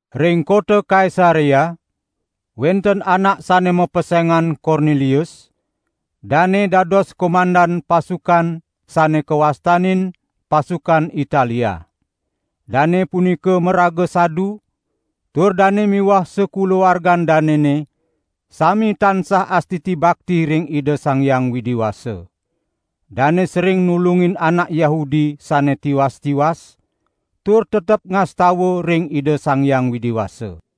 Ring kota Kaisarea wenten anak sane mapesengan Kornelius, dane dados komandan pasukan, sane kawastanin: "Pasukan Italia". Dane punika maraga sadu tur dane miwah sakulawargan danene sami tansah astiti bakti ring Ida Sang Hyang Widi Wasa. Dane sering nulungin anak Yahudi sane tiwas-tiwas, tur tetep ngastawa ring Ida Sang Hyang Widi Wasa.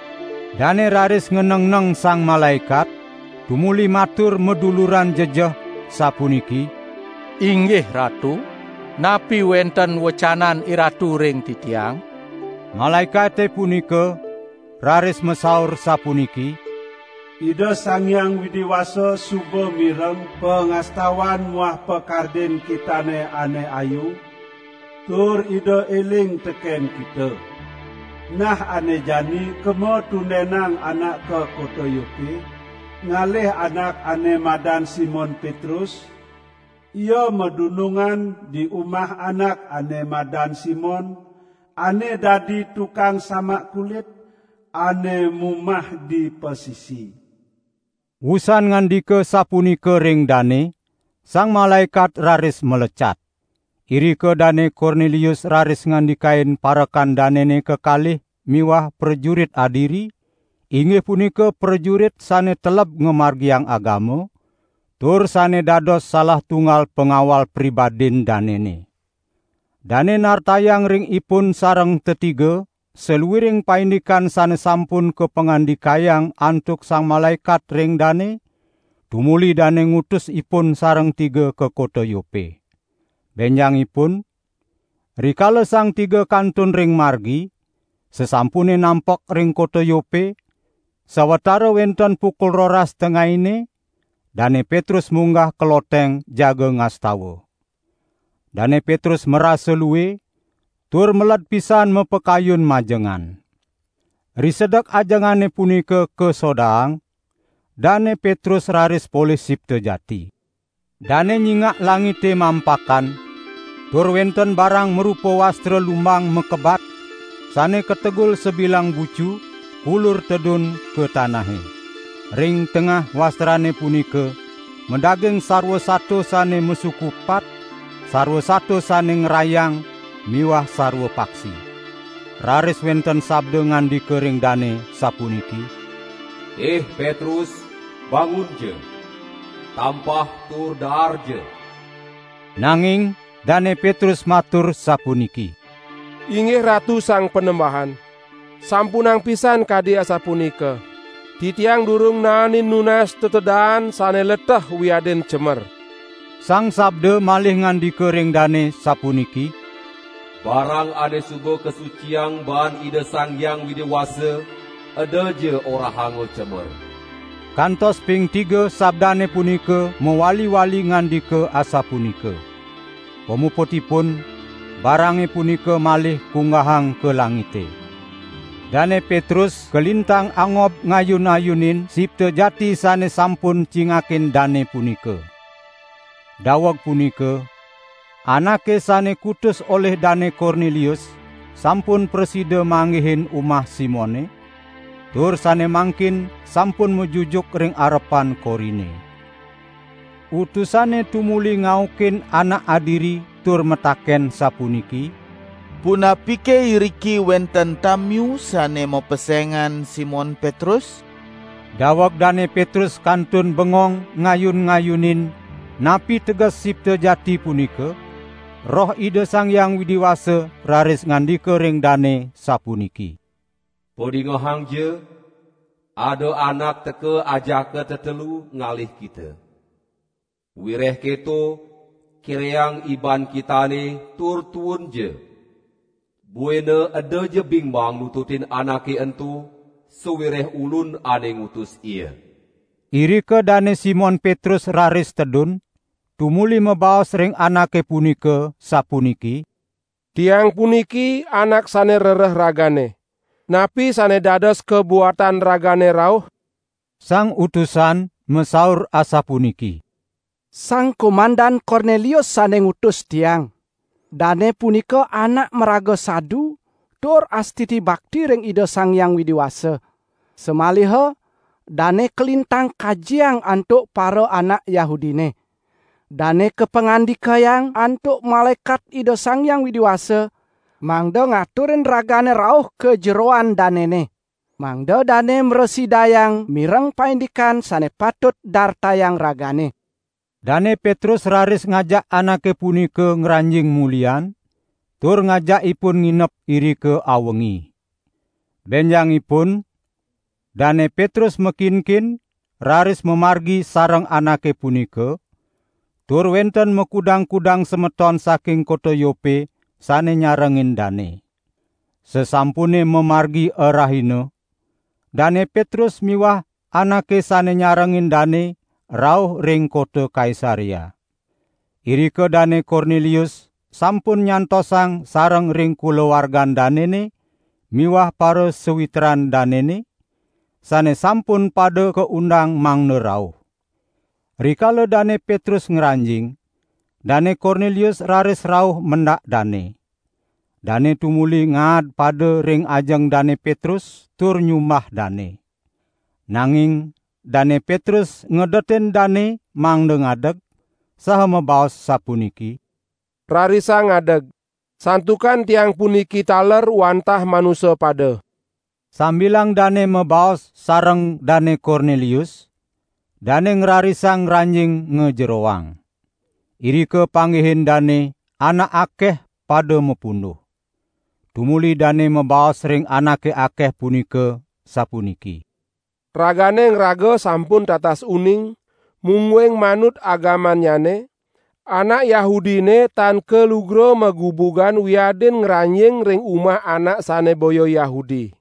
Dane raris nganengneng sang malaekat, tumuli matur maduluran jejeh, sapuniki: "Inggih Ratu, napi wenten wecanan IRatu ring titiang?" Malaekate punika raris masaur sapuniki: "Ida Sang Hyang Widi Wasa suba mireng pangastawan muah pakardin kitane ane ayu, tur Ida eling teken kita. Nah ane jani kema tundenang anak ka kota Yope, ngalih anak ane madan Simon Petrus, ia madunungan di umah anak ane madan Simon, ane dadi tukang samak kulit, ane mumah di pasisi." Wusan ngandika sapunika ring dane, sang malaekat raris malecat. Irika Dane Kornelius raris ngandikain parekan danene kekalih miwah prajurit adiri, inggih punika prajurit sane teleb ngamargiang agama, tur sane dados salah tunggal pangawal pribadin danene. Dane nartayang ring ipun sareng tetiga saluiring paindikan sane sampun kapangandikayang antuk sang malaekat ring dane, tumuli dane ngutus ipun sareng tiga ka kota Yope. Benjangipun, rikala sang tiga kantun ring margi, sasampune nampek ring kota Yope, sawatara wenten pukul roras tengaine, Dane Petrus munggah ka loteng jaga ngastawa. Dane Petrus marasa lue, tur meled pisan mapakayun majengan. Risedek ajengane punika kasodaang, Dane Petrus raris polih sipta jati. Dane nyingak langite mampakan, tur wenten barang marupa wastra lumbang makebat, sane kategul sabilang bucu, kulur tedun ka tanahe. Ring tengah wastrane punika madaging sarwa sato sane masuku patpat, sarwa sato sane ngrayang miwah sarwa paksi. Raris wenten sabda ngandika ring dane sapuniki: "Ih Petrus bangunja! Tampah tur daarja!" Nanging Dane Petrus matur sapuniki: "Inggih Ratu Sang Panembahan, sampunang pisan kadi asapunika. Titiang durung naenin nunas tetedaan sane leteh wiadin cemer." Sang sabda malih ngandika ring dane sapuniki: "Barang ane suba kasuciang baan Ida Sang Hyang Widi Wasa edaja orahanga cemer." Kantos ping tiga sabdane punika mawali-wali ngandika asapunika. Pamuputipun barange punika malih kunggahang ka langite. Dane Petrus kalintang angob ngayun-ngayunin sipta jati sane sampun cingakin dane punika. Daweg punika anake sane kutus olih Dane Kornelius sampun prasida manggihin umah Simone, tur sane mangkin sampun majujuk ring arepan korine. Utusane tumuli ngaukin anak adiri tur mataken sapuniki: "Punapike iriki wenten tamiu sane mapesengan Simon Petrus?" Daweg Dane Petrus kantun bengong ngayun-ngayunin napi teges sipta jati punika, Roh Ida Sang Hyang Widi Wasa raris ngandika ring dane sapuniki: "Padingehangja, ada anak teka ajaka tetelu ngalih kita. Wireh keto, kireang iban kitane tur tuunja. Buina edaja bingbang nututin anake ento, sawireh Ulun ane ngutus ia." Irika Dane Simon Petrus raris tedun, tumuli mabaos ring anake punika sapuniki: "Tiang puniki anak sane rereh ragane. Napi sane dados kabuatan ragane rauh?" Sang utusan masaur asapuniki: "Sang Komandan Kornelius sane ngutus tiang. Dane punika anak maraga sadu tur astiti bakti ring Ida Sang Hyang Widi Wasa. Samaliha dane kalintang kajiang antuk paraanak Yahudine. Dane kapangandikayang antuk malaekat Ida Sang Hyang Widi Wasa, mangda ngaturin ragane rauh ka jeroan danene. Mangda dane mrasidayang mireng paindikan sane patut dartayang ragane." Dane Petrus raris ngajak anake punika ngranjing mulihan, tur ngajak ipun nginep irika awengi. Benjangipun Dane Petrus makinkin raris mamargi sareng anake punika, tur wenten makudang-kudang semeton saking kota Yope sane nyarengin dane. Sasampune mamargi arahina, Dane Petrus miwah anake sane nyarengin dane rauh ring kota Kaisarea. Irika Dane Kornelius sampun nyantosang sareng ring kulawargan danene miwah parasawitran danene, sane sampun pada kaundang mangda rauh. Rikala Dane Petrus ngranjing, Dane Kornelius raris rauh mendak dane. Dane tumuli ngaadpada ring ajeng Dane Petrus tur nyumbah dane. Nanging Dane Petrus ngedetin dane mangda ngadeg, saha mabaos sapuniki: "Rarisang ngadeg, santukan tiang puniki taler wantah manusa pada." Sambilang dane mabaos sareng Dane Kornelius, dane ngrarisang ngranjing ngajeroang. Irika panggihin dane anak akeh pada mapunduh. Tumuli dane mabaos ring anake akeh punika, sapuniki: "Ragane ngraga sampun tatas uning, mungguing manut agamannyane, anak Yahudine tan kalugra magubugan wiadin ngranjing ring umah anak sane boya Yahudi.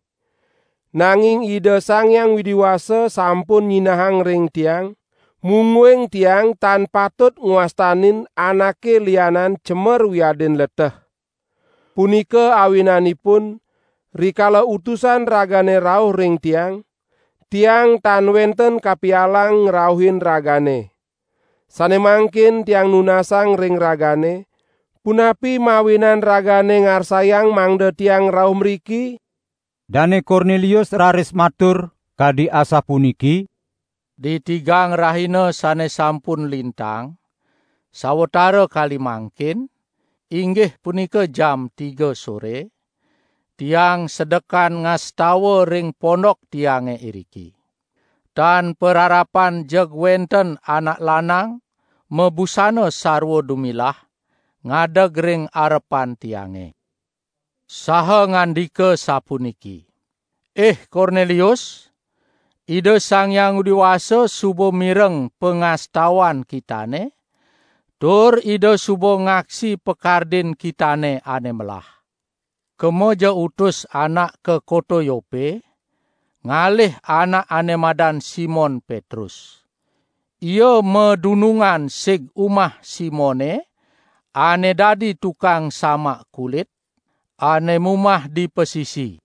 Nanging Ida Sang Hyang Widi Wasa sampun nyinahang ring tiang, mungguing tiang tan patut ngwastanin anake lianan cemer wiadin leteh. Punika awinanipun, rikala utusan ragane rauh ring tiang, tiang tan wenten kapialang ngrauhin ragane. Sane mangkin tiang nunasang ring ragane, punapi mawinan ragane ngarsayang mangda tiang rauh mriki?" Dane Kornelius raris matur, kadi asapuniki: "Ditigang rahina sane sampun lintang, sawatara kali mangkin, inggih punika jam tiga sore, tiang sedekan ngastawa ring pondok tiange iriki. Tan pararapan jeg wenten anak lanang mabusana sarwa dumilah ngadeg ring arepan tiange, saha ngandika sapuniki: 'Ih Kornelius! Ida Sang Hyang Widi Wasa suba mireng pangastawan kitane tur Ida suba ngaksi pakardin kitane ane melah. Kemaja utus anak ka kota Yope, ngalih anak ane madan Simon Petrus. Ia madunungan sig umah Simone ane dadi tukang samak kulit, ane mumah di pasisi.'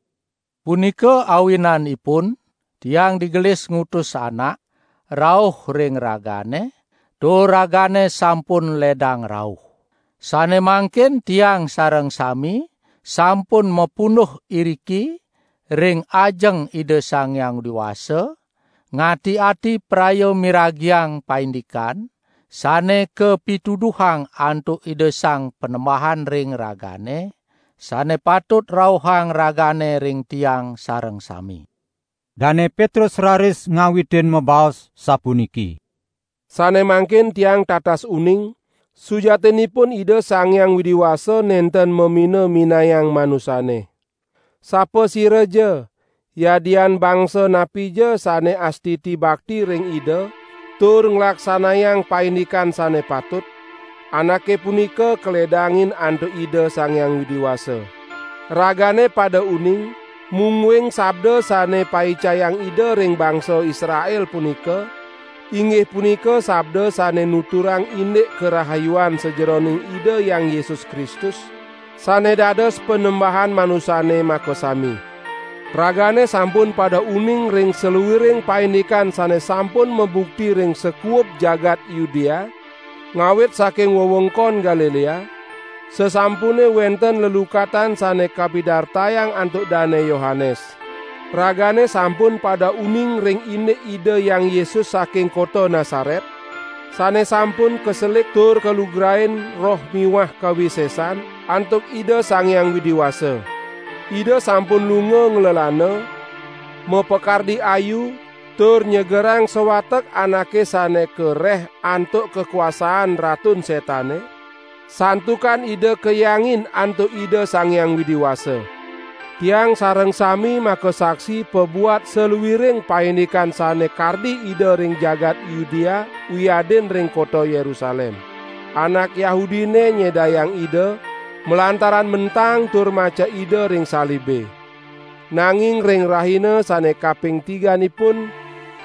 Punika awinanipun tiang digelis ngutus anak rauh ring ragane, tur ragane sampun ledang rauh. Sane mangkin tiang sareng sami sampun mapunduh iriki ring ajeng Ida Sang Hyang Widi Wasa ngati-ati praya miragiang paindikan sane kapituduhang antuk Ida Sang Panembahan ring ragane, sane patut rauhang ragane ring tiang sareng sami." Dane Petrus raris ngawitin mabaos, sapuniki: "Sane mangkin tiang tatas uning, sujatinipun Ida Sang Hyang Widi Wasa nenten mamina-minayang manusane. Sapasiraja, yadian bangsa napija sane astiti bakti ring Ida, tur nglaksanayang paindikan sane patut, anake punika kaledangin antuk Ida Sang Hyang Widi Wasa. Ragane pada uning, mungguing sabda sane paicayang Ida ring bangsa Israel punika, inggih punika sabda sane nuturang indik karahayuan sajeroning Ida Hyang Yesus Kristus, sane dados Panembahan manusane makasami. Ragane sampun pada uning ring saluiring paindikan sane sampun mabukti ring sakuub jagat Yudea, ngawit saking wewengkon Galilea, sasampune wenten lelukatan sane kapidartayang antuk Dane Yohanes. Ragane sampun pada uning ring indik Ida Hyang Yesus saking kota Nasaret, sane sampun kaselik tur kalugrain Roh miwah kawisesan antuk Ida Sang Hyang Widi Wasa. Ida sampun lunga nglelana, mapakardi ayu tur nyegerang sawatek anake sane kareh antuk kakuasaan Ratun Setane, santukan Ida kahyangin antuk Ida Sang Hyang Widi Wasa. Tiang sareng sami makasaksi pabuat saluiring paindikan sane kardi Ida ring jagat Yudea wiadin ring kota Yerusalem. Anak Yahudine nyedayang Ida, malantaran mentang tur macek Ida ring salibe. Nanging ring rahina sane kaping tiganipun,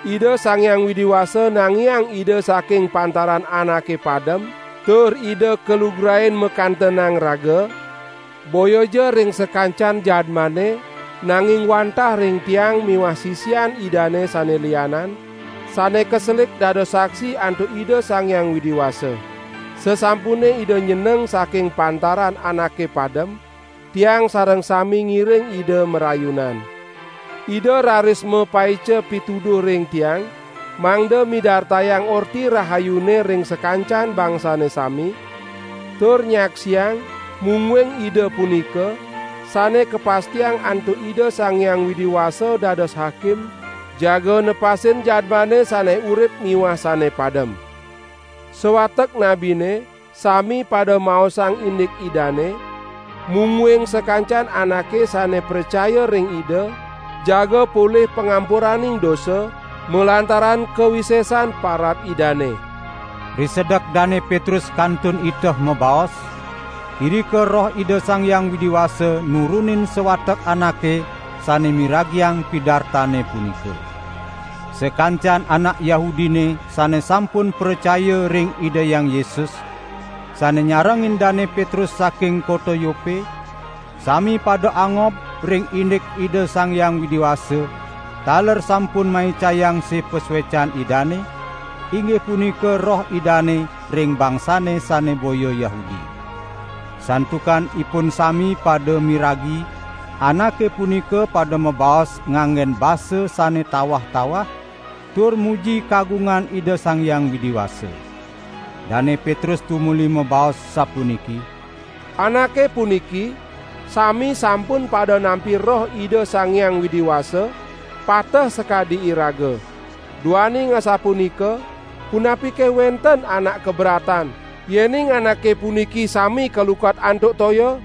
Ida Sang Hyang Widi Wasa nangiang Ida saking pantaran anake padem, tur Ida kalugrain makantenang raga, boyaja ring sakancan jadmane, nanging wantah ring tiang miwah sisian Idane sane lianan sane kaselik dados saksi antuk Ida Sang Hyang Widi Wasa. Sasampune Ida nyeneng saking pantaran anake padem, tiang sareng sami ngiring Ida marayunan. Ida raris mapaica pituduh ring tiang mangda midartayang Orti Rahayune ring sakancan bangsane sami, tur nyaksiang mungguing Ida punika sane kapastiang antuk Ida Sang Hyang Widi Wasa dados Hakim jaga nepasin jadmane sane urip miwah sane padem. Sawatek nabine sami pada maosang indik Idane, mungguing sakancan anake sane pracaya ring Ida, jaga polih pangampuraning dosa malantaran kawisesan parab Idane." Risedek Dane Petrus kantun iteh mabaos, irika Roh Ida Sang Hyang Widi Wasa nurunin sawatek anake sane miragiang pidartane punika. Sakancan anak Yahudine sane sampun pracaya ring Ida Hyang Yesus, sane nyarengin Dane Petrus saking kota Yope, sami pada angob ring indik Ida Sang Hyang Widi Wasa taler sampun maicayang sih pasuecan Idane, inggih punika Roh Idane ring bangsane sane boya Yahudi. Santukan ipun sami pada miragi anake punika pada mabaos nganggen basa sane tawah-tawah tur muji kagungan Ida Sang Hyang Widi Wasa. Dane Petrus tumuli mabaos sapuniki: "Anake puniki sami sampun pada nampi Roh Ida Sang Hyang Widi Wasa, pateh sakadi iraga. Duaning asapunika, punapike wenten anak kaberatan yening anake puniki sami kalukat antuk toya?"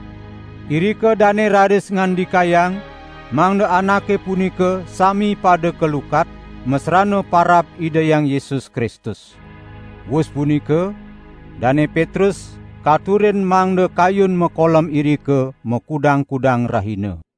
Irika dane raris ngandikayang mangda anake punika sami pada kalukat, masrana parab Ida Hyang Yesus Kristus. Wus punika Dane Petrus, katurin mangda kayun makolem irika makudang-kudang rahina.